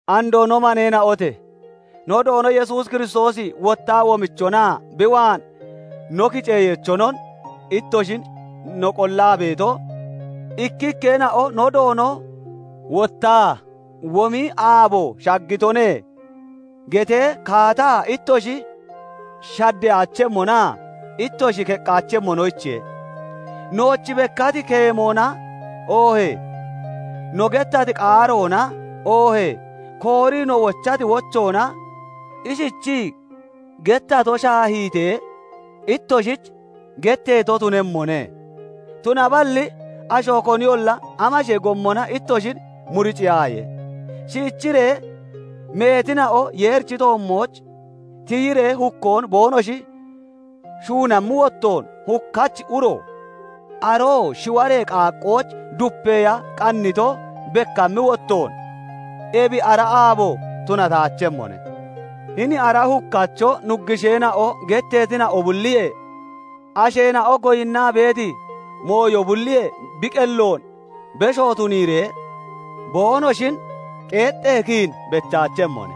Andoo no maneena'ote! No Doono Yesuus Kiristoosi wottaa womichonaa bi waan no kiceyeechonon ittoshin no qollaa beeto, ikkikkeena'o "No Doono wottaa womi aabo shaggitone" getee, kaata ittoshi shaddeyaachemmonaa ittoshi keqqaachemmonoyichiye. Nooch bekkati keemoona oohee no gettati qaaroona oohee koorii no wochati wochoona ishichii gettato shaahiitee ittoshich getteeto tunemmone. Tunaballi asho koniyolla amashee gommona ittoshin muriciyaaye; shiichiree meetina'o Yeerichi toommooch tiyiree hukkoon boonoshi shuunammi wottoon, hukkachi uro, aroo shiwaree qaaqqooch dupeya qannito bekkammi wottoon, ebi ara aabo tunataachemmone. Hini ara hukkacho nuggusheena'o getteetina'o bulliyee, asheena'o goyinnaa beeti mooyo bulliyee bi qelloon besho tuniiree, boonoshin qeexxee kiin bechaachemmone.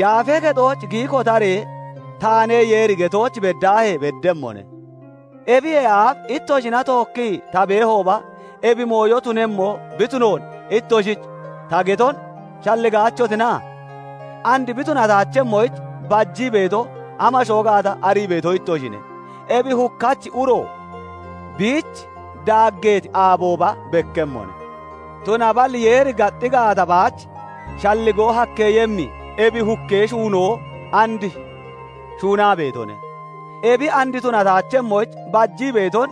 Yaafee Kexooch giyi kotaree, "Taane Yeeri" getooch beddaahee beddemmone. Ebiyee aaf ittoshina tookkii ta beehooba, ebi mooyo tunemmo bi tunoon ittoshich ta geton shalligaachotina? And bi tunataachemmoyich bajii beeto amashoo gaata arii beeto ittoshine; ebi hukkachi uro biich daaggeeti aabooba bekkemmone. Tunaballi Yeeri gaxxi gaata baach shalligoo hakkeeyemmi ebi hukkee shuunoo and shuunaa beetone; ebi and tunataachemmoyich bajii beeton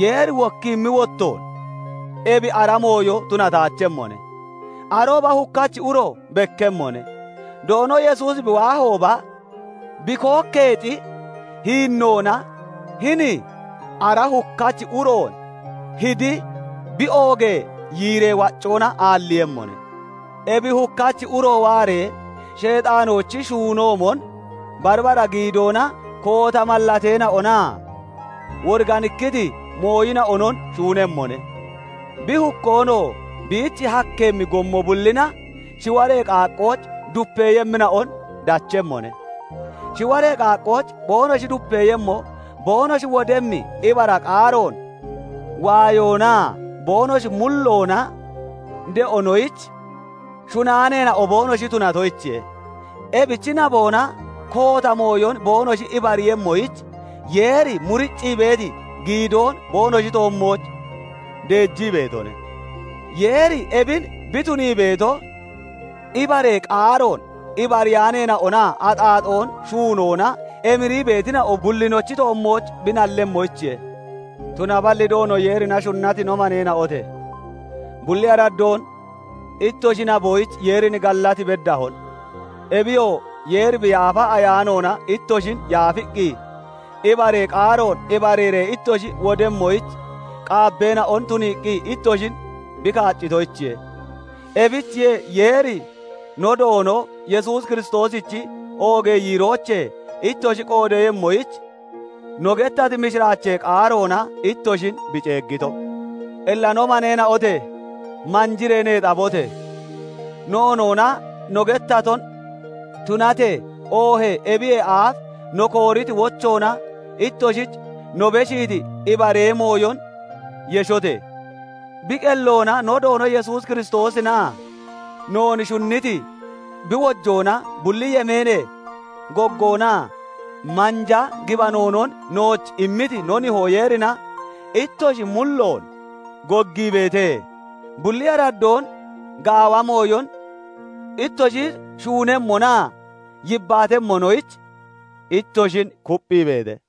Yeeri wokkiimmi wottoon ebi ara mooyo tunataachemmone. Arooba hukkachi uro bekkemmone; Doono Yesuusi bi waahooba bi kookkeexi hiinnoona hini ara hukkachi uroon hidi, bi oogee yiiree waccoona aalliiyemmone. Ebi hukkachi uro waaree, Sheexaanoochi shuunoomon bari bara giidoona koota mallateena'onaa woriganikkiti mooyina'onon shuunemmone. Bi hukkoonoo biich hakkeemmi gommo bullina shiwaree qaaqqooch dupeeyemmina'on dachemmone; shiwaree qaaqqooch boonoshi dupeeyemmo, boonoshi wodemmi ibara qaaroon waayoonaa boonoshi mulloona de'onoyich shunaaneena'o boonoshi tunatoyichiye. Ebichi naboona koota mooyon boonoshi ibariiyemmoyich, Yeeri muriccii beeti giidoon boonoshi toommooch deejii beetone. Yeeri ebin bi tunii beeto, ibaree qaaroon ibariyaaneena'onaa axaaxoon shuunoona emirii beetina'o bullinochi toommooch bi nallemmoyichiye. Tunaballi Doono Yeerina shunnati no maneena'ote! Bulli araddoon ittoshi naboyich Yeerin gallat beddahon; ebiyoo Yeeri bi Yaafa Ayaanoona ittoshin yaafiqqi, ibaree qaaroon ibariiree ittoshi wodemmoyich qaabbeena'on tuniiqqi ittoshin bi kaaccitoyichiye. Ebichiye Yeeri no Doono Yesuus Kiristoosichi oogee yiiroochee ittoshi qoodeeyemmoyich, no gettati mishiraachee qaaroona ittoshin bi ceeggito. Illa no maneena'ote! Manjiree neexabote! Noonoona no gettaton tunatee, oohee ebiyee aaf no kooriti wochoona ittoshich no beshiiti ibaree mooyon yeshote! Bi qelloona no Doono Yesuus Kiristoosinaa noon shunniti, bi wojoona bulli yemeenee goggoonaa manja gibanoonon nooch immiti no Nihoo Yeerina ittoshi mulloon goggiibeete; bulli araddoon gaawa mooyon ittoshi shuunemmonaa yibbaatemmonoyich ittoshin kupphiibeete.